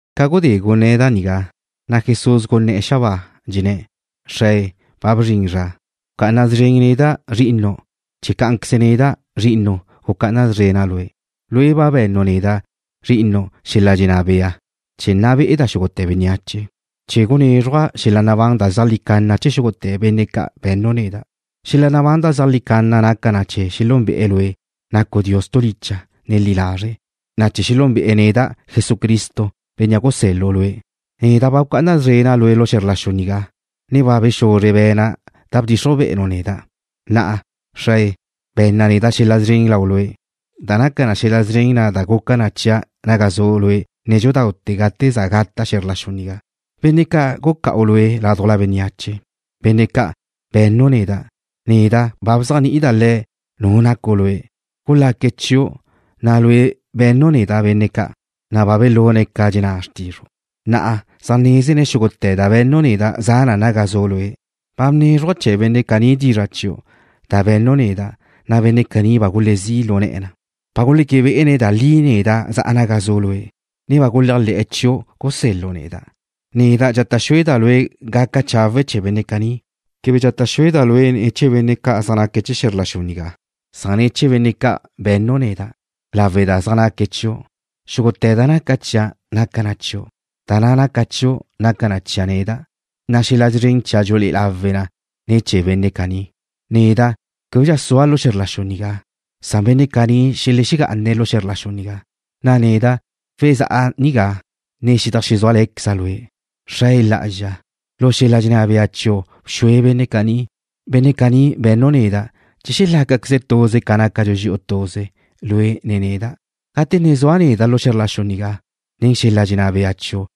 Ca gudé gunné̱' da nigá, na' Jesús gunné̱'e̱ xabáa, dxenné̱': ―Xrae, ba bzrin zra. Bca'ana szren neda', Zri'inu', chee̱ cá'anqueze neda', Zri'inu', gucá'ana szrena' Lue'. Lue' ba be̱nnu' neda', Zri'inu', xel-la' dxenná bea chee̱ nna be'eda' xúgute̱ bénneache, chee̱ gunézruja' xel-la' nabán da zeajlí canna chee̱ xúgute̱ benne' ca' be̱nnu' neda'. Xel-la' nabán da zeajlí canna naca na chee̱ xelúnbe'e̱ Lue', nacu' Dios tu licha', ne li lazre', na' chee̱ xelúnbe'e̱ neda', Jesucristo, Bénnea' gusel-lu' Lue'. ’Neda' ba bca'ana szrena' Lue' lu xe̱zr la xu nigá, ne ba bexuzre be̱na' da bdxixruj be'enu' neda'. Na'a, Xrae, be̱nna neda' xel-la' szren lau Lue', da naca na xel-la' szren na' da guca na chia' naga zu' Lue' nédxudaute̱ gate za gata' xe̱zr la xu nigá. ’Benne' ca' guca'u Lue' ládujla bénneache, benne' ca' be̱nnu' neda', neda' ba bzéajni'ida' le̱' Nu nacu' Lue'. Gulaque̱' chiu', na' Lue' be̱nnu' neda' benne' ca', na' ba belune̱' ca dxenná xrtizru'. Na'a zaj nézene̱' xúgute̱ da be̱nnu' neda' za na naga zu' Lue'. Ba bnézruja' chee̱ benne' caní dizra' chiu' da be̱nnu' neda', na' benne' caní ba gulezí' lu ne̱'e̱ na. Ba guleque bé'ene̱' da li neda' za'a naga zu' Lue', ne ba guléajle̱'e̱ chiu', gusel-lu' neda'. ’Neda' dxata' xueda' Lue' gaca chawe' chee̱ benne' caní. Quebe dxata' xueda' Lue' ne̱ chee̱ benne' ca' zaj naque̱' chee̱ xe̱zr la xu nigá. Dxenaba' Lue' ne̱ chee̱ benne' ca' be̱nnu' neda', lawe' da zaj naque̱' chiu'. Xúgute̱ da naca chia' naca na chiu', na' da naca chiu' naca na chia' neda', na' xel-la' szren chia' dxulé'e lawe' na ne̱ chee̱ benne' caní. ’Neda' québedxa sua' lu xe̱zr la xu nigá, san benne' caní xelexegá'ane̱' lu xe̱zr la xu nigá, na' neda' wezá'a nigá, ne xedajxezúale̱queza' Lue'. Xrae Lá'azxa, lu xel-la' dxenná bea chiu' bxue benne' caní, benne' ca' be̱nnu' neda', chee̱ xelácaqueze̱' tuze ca nácadxu dxi'u tuze, Lue' ne neda'. Gate ne zua' neda' lu xe̱zr la xu nigá, bxua' benne' caní nen xel-la' dxenná bea chiu',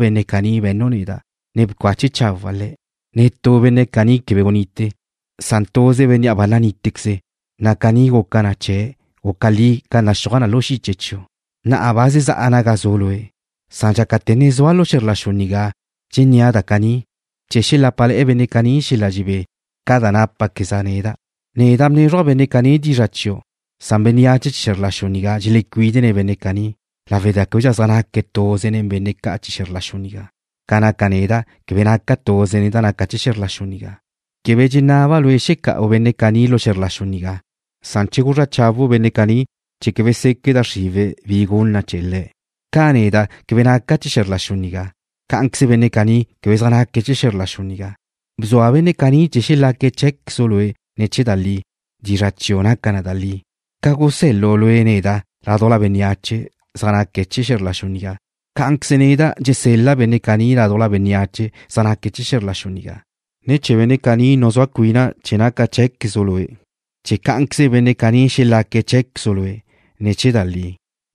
benne' caní be̱nnu' neda', ne bcache chawa' le̱'. Netú benne' caní quebe gunite, san tuze bénnea' ba nanítequeze̱', na' caní guca na chee̱ guca li ca naxúaj na lu xiche chiu'. ’Na'a ba zezá'a naga zu' Lue'. Dxácate̱ ne zua' lu xe̱zr la xu nigá dxennéa' da caní chee̱ xelápale̱'e̱ benne' caní xel-la' dxebé ca da nápaqueza' neda'. Neda' bnézruja' benne' caní dizra' chiu'. Bénneache chee̱ xe̱zr la xu nigá dxelecuídene̱' benne' caní lawe' da québedxa zaj naque̱' tuze nen benne' ca' chee̱ xe̱zr la xu nigá, ca na' neda' quebe naca' tuze nen da naca chee̱ xe̱zr la xu nigá. Quebe dxenaba' Lue' xeca'u benne' caní lu xe̱zr la xu nigá. Dxenaba' guzrá chawu' benne' caní chee̱ quebe seque' da xriwe̱' bi gun na chee̱' le̱'. Ca neda' quebe naca' chee̱ xe̱zr la xu nigá, cá'anqueze benne' caní quebe zaj naque̱' chee̱ xe̱zr la xu nigá. Bzua benne' caní chee̱ xelaque̱' cheé̱quezu' Lue' ne̱ chee̱ da li. Dizra' chiu' naca na da li. Ca gusel-lu' Lue' neda' ládujla bénneache zaj naque̱' chee̱ xe̱zr la xu nigá, cá'anqueze neda' dxusel-le̱' benne' caní ládujla bénneache zaj naque̱' chee̱ xe̱zr la xu nigá. Ne̱ chee̱ benne' caní nuzúa cuina' cheé̱quezu' Lue', chee̱ cá'anqueze benne' caní xelaque̱' cheé̱quezu' Lue' ne̱ chee̱ da li.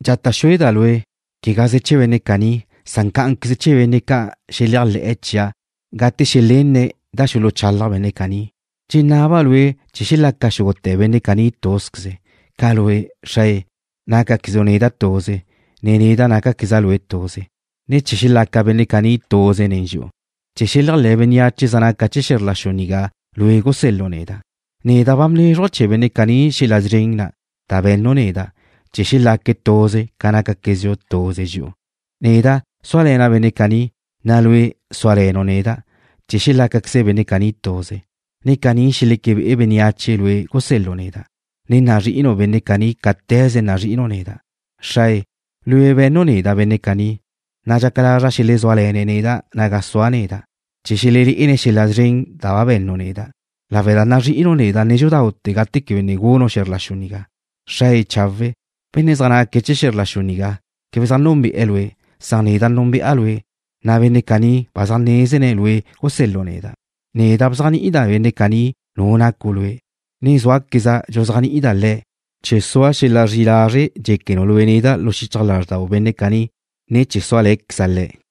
’Dxata' xueda' Lue', quegaze chee̱ benne' caní, san cá'anqueze chee̱ benne' ca' xeléajle̱'e̱ chia' gate xelenne̱' da xuluchalaj benne' caní. Dxenaba' Lue' chee̱ xelaca xúgute̱ benne' caní túzqueze, ca Lue', Xrae, nácaquezu' neda' tuze, ne neda' nácaqueza' Lue' tuze, ne chee̱ xelaca benne' caní tuze nen dxi'u, chee̱ xeléajle̱ bénneache zaj naca chee̱ xe̱zr la xu nigá Lue' gusel-lu' neda'. Neda' ba bnézruja' chee̱ benne' caní xel-la' szren na' da be̱nnu' neda' chee̱ xelaque̱' tuze ca nácaquezdxu tuze dxi'u. Neda' súale̱na' benne' caní, na' Lue' súale̱nu' neda', chee̱ xelácaqueze benne' caní tuze, na' caní xeleque be'e bénneache Lue' gusel-lu' neda', ne nazrí'inu' benne' caní cáte̱ze nazrí'inu' neda'. ’Xrae, Lue' be̱nnu' neda' benne' caní, na' dxaca lazra' xelezúale̱ne̱' neda' naga sua' neda', chee̱ xelelé'ene̱' xel-la' szren da ba be̱nnu' neda', lawe' da nazrí'inu' neda' nédxudaute̱ gate quebe ne gunu' xe̱zr la xu nigá. Xrae chawe', benne' zaj naque̱' chee̱ xe̱zr la xu nigá quebe zaj núnbe'e̱ Lue', san neda' núnbe'a Lue', na' benne' caní ba zaj nézene̱' Lue' gusel-lu' neda'. Neda' bzéajni'ida' benne' caní Nu nacu' Lue', ne zúaqueza' dxuzéajni'ida' le̱' chee̱ sua xel-la' zri'i lazre' dxéquenu' Lue' neda' lu xichaj lázrdau benne' caní, ne chee̱ súale̱ néda'queza' le̱'.